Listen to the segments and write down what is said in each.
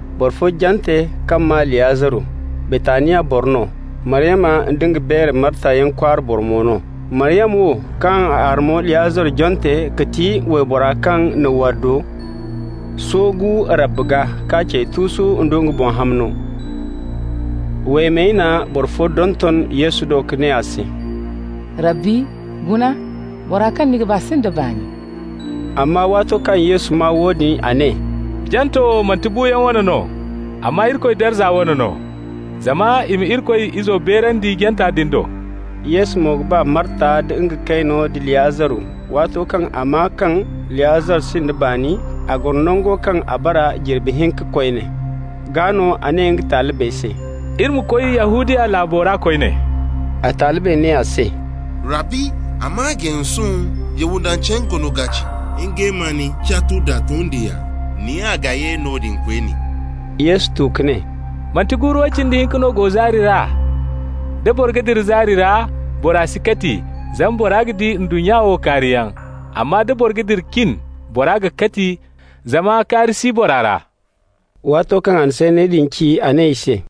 Boro fo jante kaŋ maa Liyaziru, Baytaniya boro no, Maryama nda nga beere Marta yaŋ kwaara boro mo no. Maryama wo, kaŋ a arme Liyaziru jante, ga ti waybora kaŋ na waddo soogu Rabbi gaa k'a cey tuusu nda nga boŋ hamno. Waymey na boro fo donton Yesu do ka ne a se: «Rabbi, guna, bora kaŋ ni ga ba sinda baani.» Amma waato kaŋ Yesu maa woodin, a ne: «Janto wo manti buuyaŋ wane no, amma Irikoy darza wane no, zama i ma Irikoy Izo beerandi janta din do.» Yesu mo ga ba Marta nd'a kayno da Liyaziru. Waato kaŋ a maa kaŋ Liyaziru sinda baani, a goro nango kaŋ a bara jirbi hinka koyne. Gaa no a ne nga talibey se: «Iri ma koy Yahudiya laabo ra koyne.» A talibey ne a se: «Rabbi, a mana gay sohõ, Yahudancey goono ga ceeci ngey ma ni catu nda tondiyaŋ. Ni ga ye noodin koyne?» Yesu tu ka ne: «Manti guuru way cindi hinka no go zaari ra? Da boro ga dira zaari ra, boro si kati, zama bora ga di ndunnya wo kaariyaŋ. Amma da boro ga dira cin, boro ga kati, zama kaari si bora ra.» Waato kaŋ a na sanney din ci, a ne i se: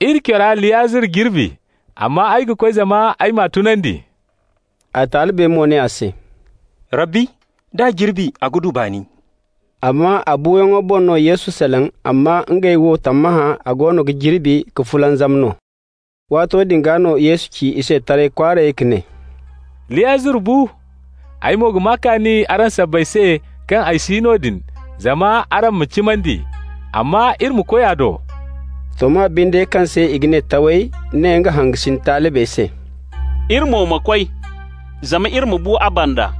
«Iri cora Liyaziru jirbi, amma ay ga koy zama ay m'a tunandi.» A talibey mo ne a se: «Rabbi, d'a jirbi a ga du baani.» Amma a buuyaŋo boŋ no Yesu salaŋ, amma ngey wo tammahã a goono ga jirbi ka fulanzam no. Waato din gaa no Yesu ci i se taray kwaaray ka ne: «Liyaziru bu. Ay mo ga maa kaani araŋ sabbay se kaŋ ay si noodin, zama araŋ ma cimandi. Amma iri ma koy a do.» Toma binde kaŋ se i ga ne Taway ne nga hangasin talibey se: «Iri mo ma koy, zama iri ma bu a banda.»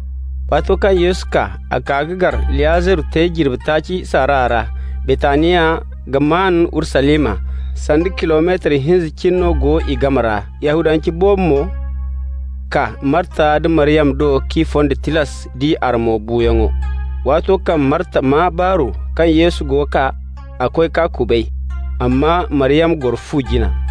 Waato kaŋ Yesu kaa, a kaa ka gar Liyaziru te jirbi taaci saara ra. Baytaniya ga maan Urusalima, sanda kilometar hinza cine no go i game ra. Yahudance boobo mo kaa Marta nda Maryama do k'i fonda tilas d'i armo buuyaŋo. Waato kaŋ Marta maa baaru kaŋ Yesu go kaa, a koy k'a kubay, amma Maryama goro fu jina.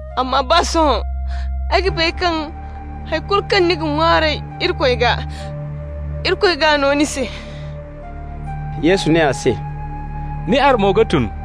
Amma baa sohõ ay ga bay kaŋ hay kulu kaŋ ni ga ŋwaaray Irikoy gaa, Irikoy g'a no ni se.» Yesu ne a se: «Ni armo ga tun.»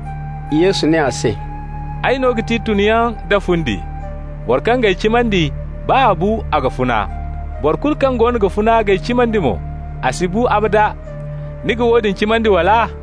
Yesu ne a se: «Ay no ga ti tunyaŋ da fundi. Boro kaŋ g'ay cimandi, baa a bu, a ga funa. Boro kulu kaŋ goono ga funa k'ay cimandi mo, a si bu abada. Ni ga woodin cimandi, wala?»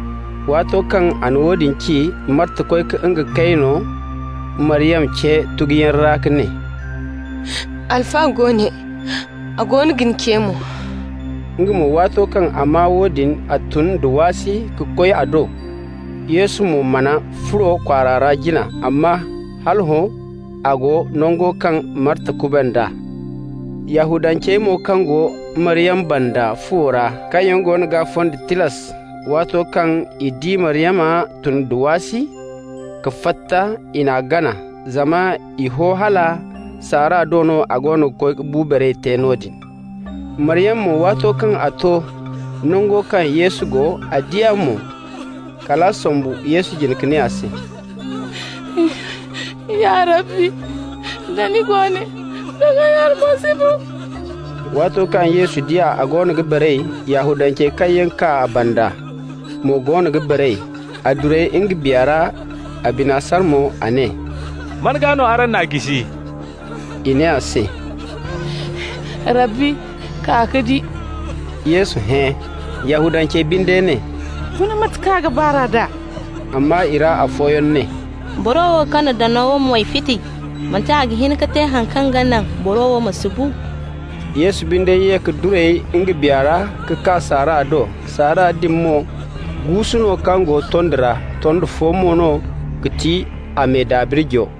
Waato kaŋ a na woodin ci, Marta koy ka nga kayno Maryama ce tuguyaŋ ra ka ne: «Alfa go ne. A goono ga ni ce mo.» Nga mo, waato kaŋ a maa woodin, a tun da waasi ka koy a do. Yesu mo mana furo kwaara ra jina, amma hal hõ a go nango kaŋ Marta kuband'a. Yahudancey mo kaŋ go Maryama banda fuwo ra, kaŋ yaŋ goono g'a fonda tilas, waato kaŋ i di Maryama tun da waasi ka fatta, i n'a gana. Zama i ho hala saara do no a goono ga koy ka bu baray te noodin. Maryama mo, waato kaŋ a to nango kaŋ Yesu go, a di a mo, kal a sombu Yesu jine ka ne a se: «Ya Rabbi, da ni go ne, doŋ ay armo si bu.» Waato kaŋ Yesu di a goono ga baray, Yahudancey kaŋ yaŋ kaa a banda mo goono ga baray, a duray nga biya ra, a bina sara mo. A ne: «Man gaa no araŋ n'a jisi?» I ne a se: «Rabbi, kaa ka di.» Yesu hẽ. Yahudancey binde ne: «Guna mate kaŋ a ga ba r'a d'a!» Amma i ra boro fooyaŋ ne: «Boro wo kaŋ na danawo moy fiti, manti a ga hin ka te haŋ kaŋ ga naŋ boro wo ma si bu?» Yesu binde ye ka duray nga biya ra ka kaa saara do. Saara din mo guusu no kaŋ go tondi ra, tondi fo mo no ga ti a me dabirjo.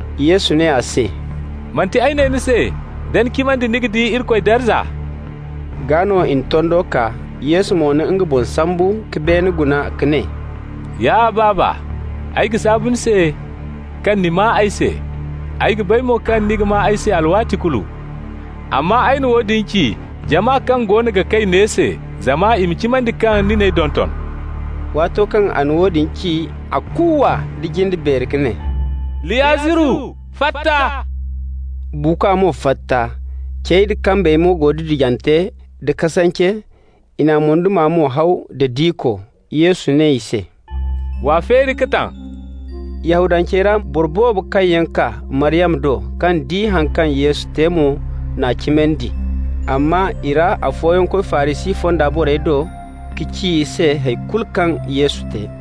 Yesu ne a se: «Manti ay ne ni se da ni cimandi, ni ga di Irikoy darza?» Gaa no i na tondo kaa. Yesu mo na boŋ sambu ka beene guna ka ne: «Ya Baaba, ay ga saabu ni se kaŋ ni maa ay se. Ay ga bay mo kaŋ ni ga maa ay se alwaati kulu, amma ay na woodin ci jama kaŋ goono ga kay ne se, zama i ma cimandi kaŋ ni n'ay donton.» Waato kaŋ a na woodin ci, a kuuwa da jinde beeri ka ne: «Liyaziru, fatta!» Buukwa mo fatta, cey da kambey mo go didijante da kasance, i n'a moyduma mo haw da diko. Yesu ne i se: «W'a feeri ka taŋ.» Yahudancey ra boro boobo kaŋ yaŋ kaa Maryama do, kaŋ di haŋ kaŋ Yesu te mo, n'a cimandi. Amma i ra afooyaŋ koy Farisi fonda borey do ka ci i se hay kulu kaŋ Yesu te.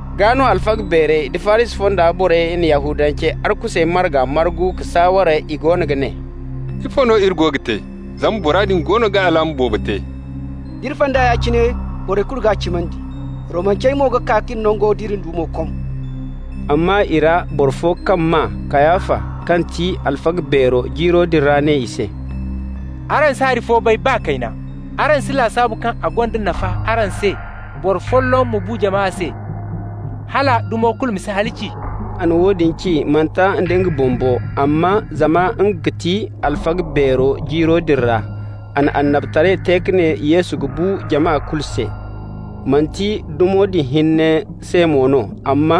Gaa no alfaga beerey da Farisi fonda borey na Yahudancey arkusey marga margu ka saaware. I goono ga ne: «Ifo no iri go ga te? Zama bora din goono ga alaama boobo te. D'iri fay d'a ya-cine, borey kulu g'a cimandi. Romancey mo ga kaa k'iri nango nd'iri dumo kom.» Amma i ra boro fo kaŋ maa Kayafa kaŋ ti alfaga beero jiiro din ra ne i se: «Araŋ si hay fo bay, baa kayna. Araŋ si lasaabu kaŋ a gonda nafa araŋ se boro folloŋ ma bu jama se, hala dumo kulu ma si halaci?» A na woodin ci, manti nda nga boŋ bo, amma zama nga ga ti alfaga beero jiiro din ra, a na annabitaray te ka ne Yesu ga bu jama kulu se. Manti dumo din hinne se mo no, amma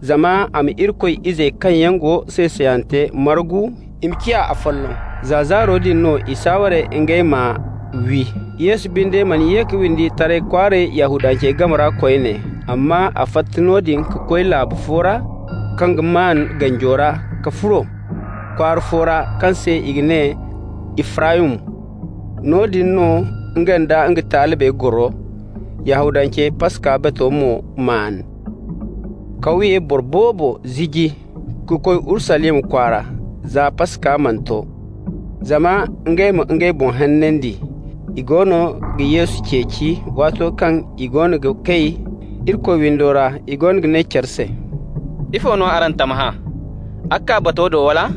zama a ma Irikoy izey kaŋ yaŋ go say-sayante margu i ma ciya afolloŋ. Za zaaro din no i saaware ngey m'a wi. Yesu binde mana ye ka windi taray kwaaray Yahudancey game ra koyne. Amma a fatta noodin ka koy laabu fo ra kaŋ ga maan ganjo ra ka furo kwaara fo ra kaŋ se i ga ne Ifraymu. Noodin no nga nda nga talibey goro. Yahudancey Paska bato mo maan. Kawye boro boobo ziji ka koy Urusalima kwaara za Paska mana to, zama ngey ma ngey boŋ hanandi. I goono ga Yesu ceeci. Waato kaŋ i goono ga kay Irikoy windo ra i goono ga ne care se: «Ifo no araŋ ga tammahã? A ga kaa bato do, wala?»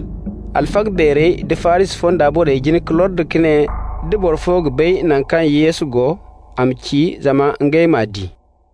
Alfaga beerey da Farisi fonda borey jin ka lordi ka ne da boro fo ga bay naŋ kaŋ Yesu go, a ma ci zama ngey m'a di.